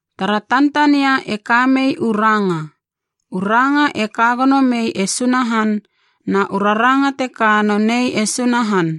Tara tantania e kamei u Ranga, u Ranga e kagono mei e Sunahan na u Raranga teka nonei e Sunahan.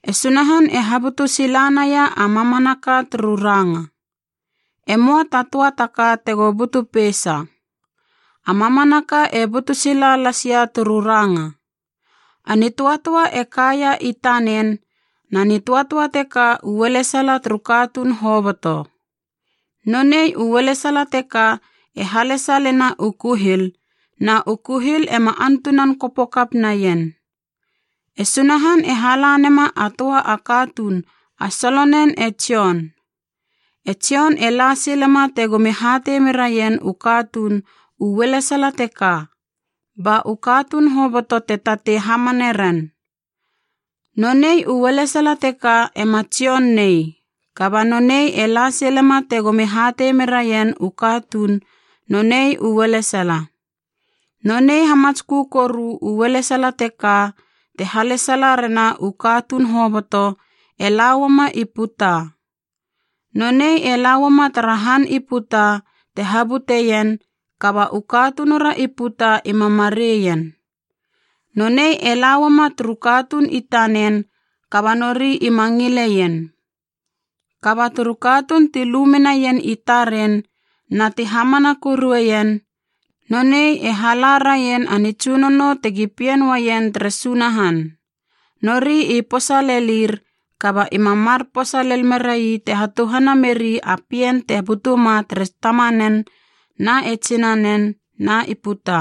E Sunahan e habutu silanaia a mamanaka turu Ranga. E möa ta töa taka tega butu peisa. A mamanaka e butu sila lasia turu Ranga. A nitöatöa e kaia i tanen, na nitöatöa teka u ualesala turu katuun hoboto. Nonei u ualesala teka e halesalena u kuhil, na u kuhil ema antunan kopo kap naien. E Sunahan e hala nema a töa a katuun a solonen e Jon. E Jon e la silema tegomi hatei meraien u katuun u ualesala teka, ba u katuun hoboto te tatei hamane ren. Nonei u ualesala teka ema Jon nei, kaba nonei e la silema tegomi hatei meraien u katuun nonei u ualesala. Nonei hamatskö koru u ualesala teka te halesala rena u katuun hoboto e lauama i puta. Nonei e lauama tara han i puta te habuteien, kaba u katunura i puta ima mareien. Nonei e la uama turu katuun i tanen kaba nori ima ngileien. Kaba turu katuun ti lu menaien i taren na ti hamana korueien, nonei e hala raien a nitsunono tegi pien uaien tere Sunahan. Nori i posa lelir, kaba ima mar posa lel merai te hatuhana meri a pien te butunama tere tamanen na e tsinanen na i puta.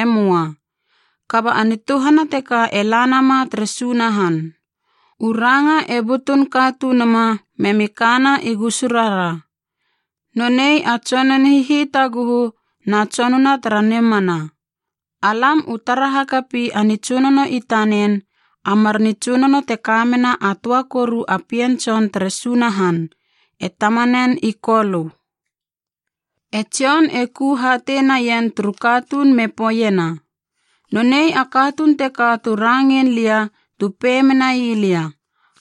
E möa. Kaba a nituhana teka e la nama tere Sunahan. U Ranga e butun katunuma memi kana i gusurara. Nonei a tsonun hihitaguhu na tsonuna tara nimana. Alam u tara hakapi a nitsunono i tanen, a mar nitsunono te kamena a töa koru a Pien Tson tere Sunahan, e Tamanen i Kolö. E Jon e ku hatei naien turu katuun me poeiena, “Nonei a katuun teka tu rangein lia tu pei menai lia,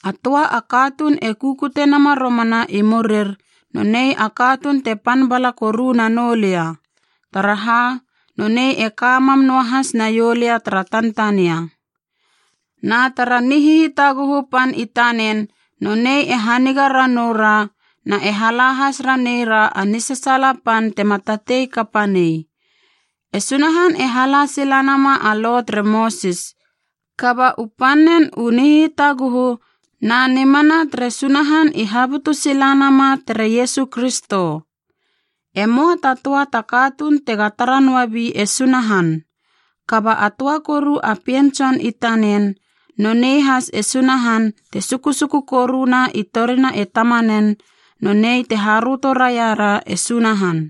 ‘A töa a katuun e kukute nama romana i murir nonei a katuun te pan bala koru nanou lia, taraha nonei e ka mam noahas naiou lia tara Tantania.’” Na tara nihitaguhu pan i tanen nonei e haniga ranou ra na e hala has ranei ra a nisasaala pan tema tatei kapa nei. E Sunahan e hala silanama a Lo tere Mosis, kaba u pannen u nihitaguhu na nimana tere Sunahan i habutu sila nama tere Iesu Kristo. E möa ta töa ta katuun tega tara noabi e Sunahan. Kaba a töa koru a Pien Tson i tanen, nonei has e Sunahan te sukusuku koruna i torina e Tamanen, nonei te haröto raira e Sunahan.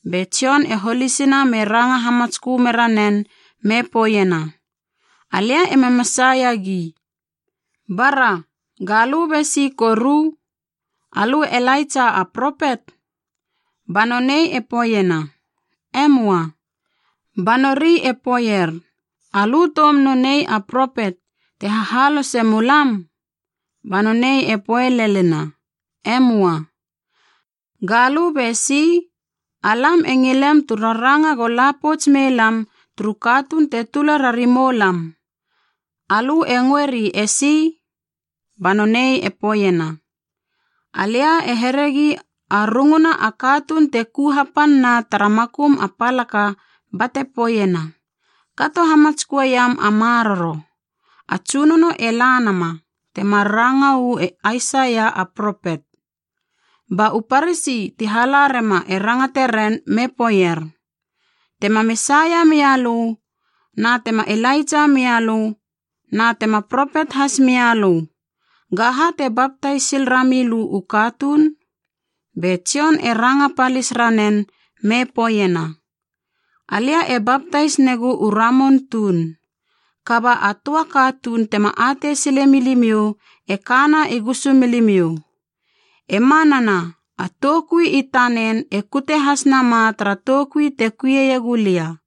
Be Jon e holisina me ranga hamatskö mera nen me poeiena, “Alia ema Mesaia gi.” “Bara, galö besi koru? Alö e Ilaitsa a propet?” Ba nonei e poeiena, “E möa.” Ba nori e poeier, “Alö toum nonei a propet te hahalose mulam?” Ba nonei e poe lelena, “E möa.” “Galö besi? Alam e ngilem tu raranga go lapouts mei lam turu katuun te tula rari moulam. Alö e ngöeri esi?” Ba nonei e poeiena, “Alia e heregi a runguna a katuun te ku hapanna tara makum a palaka bate poeiena, ‘Kato hamatsköeiam a maroro, a Tsunono e la nama,’ temar ranga uu e Aisaia a propet.” Ba u Parasi ti hala rema e rangate ren me poeier, “Tema Mesaia mia lö na tema Ilaitsa mia lö na tema Propet hasmia lö, gaha te baptais sil rami lö u katuun?” Be Jon e ranga palis ranen me poeiena, “Alia e baptais negu u ramun tuun. Kaba a töa katuun tema atei sile milimiou e kana i gusumilimiou. E manana a toukui i tanen e kute has nama tara toukui te kuieiegu lia,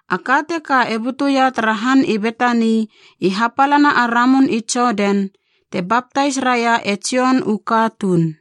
A ka teka e butuia tara han i Betani i hapalana a ramun i Jodan, te baptais raia e Jon u katuun.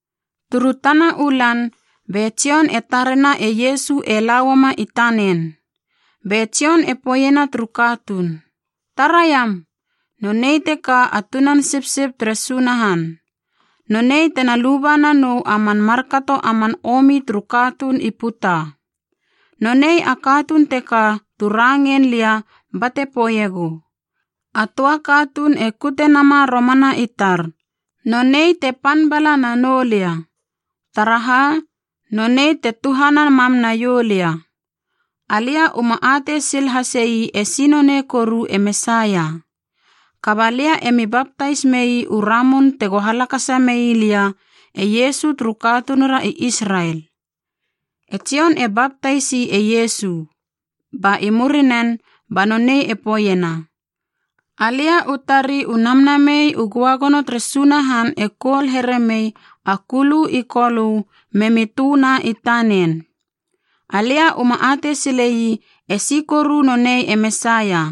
Turu tana u lan be Jon e tarena e Iesu e la uama i tanen, be Jon e poeiena turu katuun, “Taraiam, nonei teka a Tunan Sipsip tere Sunahan. Nonei tena luba nanou a man markato a man omi turu katuun i puta. Nonei a katuun teka tu rangein lia bate poeiegu, ‘A töa katuun e kute nama romana i tar, nonei te pan bala nanou lia, taraha nonei te tuhana mam naiou lia.’ Alia uma atei sil hasei esi nonei koru e Mesaia. Kaba lia emi baptais mei u ramun tego halakasa mei lia e Iesu turu katunura i Israel.” E Jon e baptaisi e Iesu, ba i murinen ba noneib e poeiena, “Alia u tari u Namnamei u Göagono tere Sunahan e koul here mei a kulu i Kolö memi tö na i tanen. Alia uma atei silei esi koru nonei e Mesaia.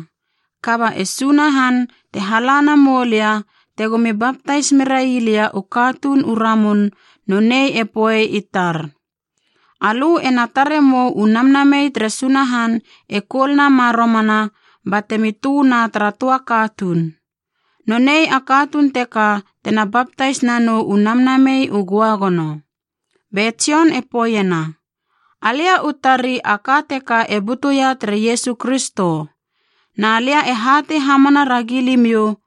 Kaba e Sunahan, te hala namou lia tegomi baptais merai lia u katuun u ramun, nonei e poei i tar, ‘Alö ena tare mou u Namnamei tere Sunahan e koul nama romana batemi tö na tara töa katuun. Nonei a katuun teka tena baptais nanou u Namnamei u Göagono.’” Be Jon e poeiena, “Alia u tari a ka teka e butuia tere Iesu Kristo, na lia e hatei hamana ragi limiou,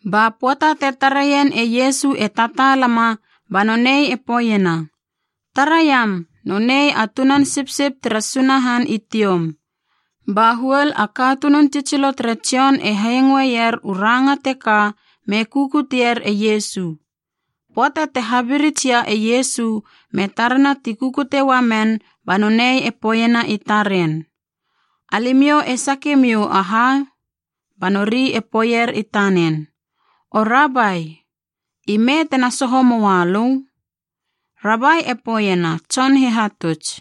Ba pöata te tareien e Iesu e tataalama ba nonei e poeiena, “Taraiam nonei a Tunan Sipsip tere Sunahan i tioum.” Ba huol a katunun tsitsilo tere Jon e hengoeier u ranga teka me kukutier e Iesu. Pöata te habirits ia e Iesu me tarena ti kukute uamen ba nonei e poeiena i taren, “Alimiou e sake miou aha?” Ba nori e poeier i tanen, “O Rabai, ime tena soho moa lö?” (Rabai e poeiena, tson hihatuts.)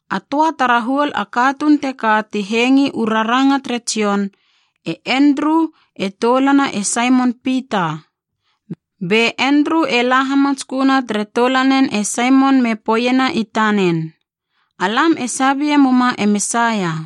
A töa tara huol a katuun teka ti hengi u raranga tere Jon, e Endru e toulana e Saimon Pita. Be Endru e la hamatsköna tere toulanen e Saimon me poeiena i tanen, “Alam e sabie muma e Mesaia.”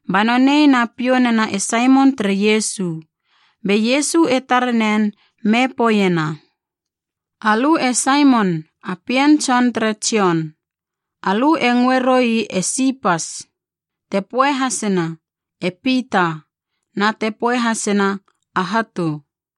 Ba nonei na piou nena e Saimon tere Iesu. Be Iesu e tare nen me poeiena, “Alö e Saimon, a pien tson tere Jon. Alö e ngöe roi e Sipas” (te poe hasena, “e Pita,” na te poe hasena, “a Hatu”).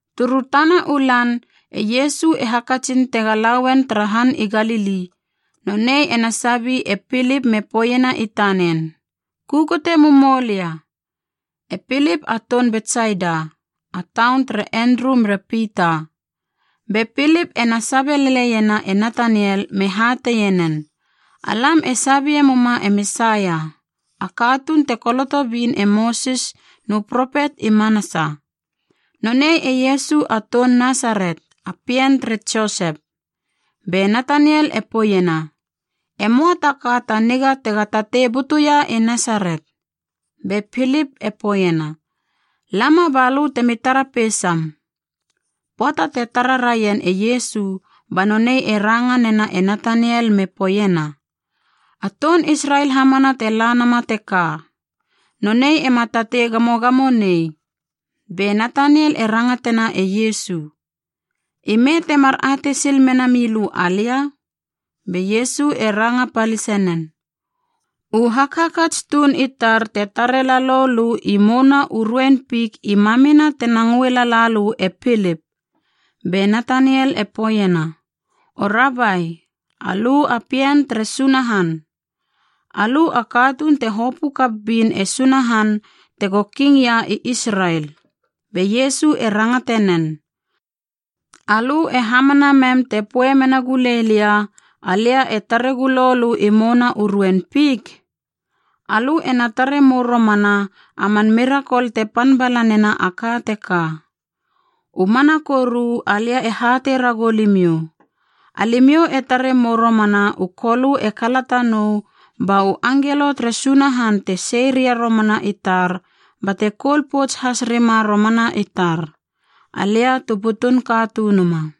Turu tana u lan e Iesu e hakatsin tega lauen tara han i Galili. Nonei ena sabi e Pilip me poeiena i tanen, “Kukute mumou lia.” E Pilip a toun Betsaida, a taun tere Endru mere Pita. Be Pilip e na sabe leleiena e Nataniel me hateie nen, “Alam e sabie muma e Mesaia, a katuun te koloto bin e Mosis nu propet i manasa! Nonei e Iesu a toun Nasaret, a pien tere Josep.” Be Nataniel e poeiena, “E möa ta ka ta niga tega tatei butuia i Nasaret.” Be Pilip e poeiena, “Lama balö temi tara peisam.” Pöata te tara raien e Iesu ba nonei e ranga nena e Nataniel me poeiena, “A toun Israel hamana te la nama teka. Nonei ema tatei gamogamo nei.” Be Nataniel e rangatena e Iesu, “Ime temar atei sil mena milö alia?” Be Iesu e ranga palise nen, “U hakhakats tuun i tar te tare lalou lö i mouna u ruein fik i mamina tena ngöe lala lö e Pilip.” Be Nataniel e poeiena, “O Rabai, alö a Pien tere Sunahan! Alö a katuun te hopö kap bin e Sunahan tego Kingia i Israel!” Be Iesu e rangate nen, “Alö e hamana mem te poe mena gulei lia, alia e tare gulo lö i mouna u ruein fik? Alö ena tare mou romana a man mirakol te pan bala nena a ka teka. U mana koru alia e hatei ragou limiou, alimiou e tare mou romana u Kolö e kalata nou ba u angelo tere Sunahan te sei ria romana i tar bate koul pouts has rima romana i tar, Alia tu butun Katunuma.”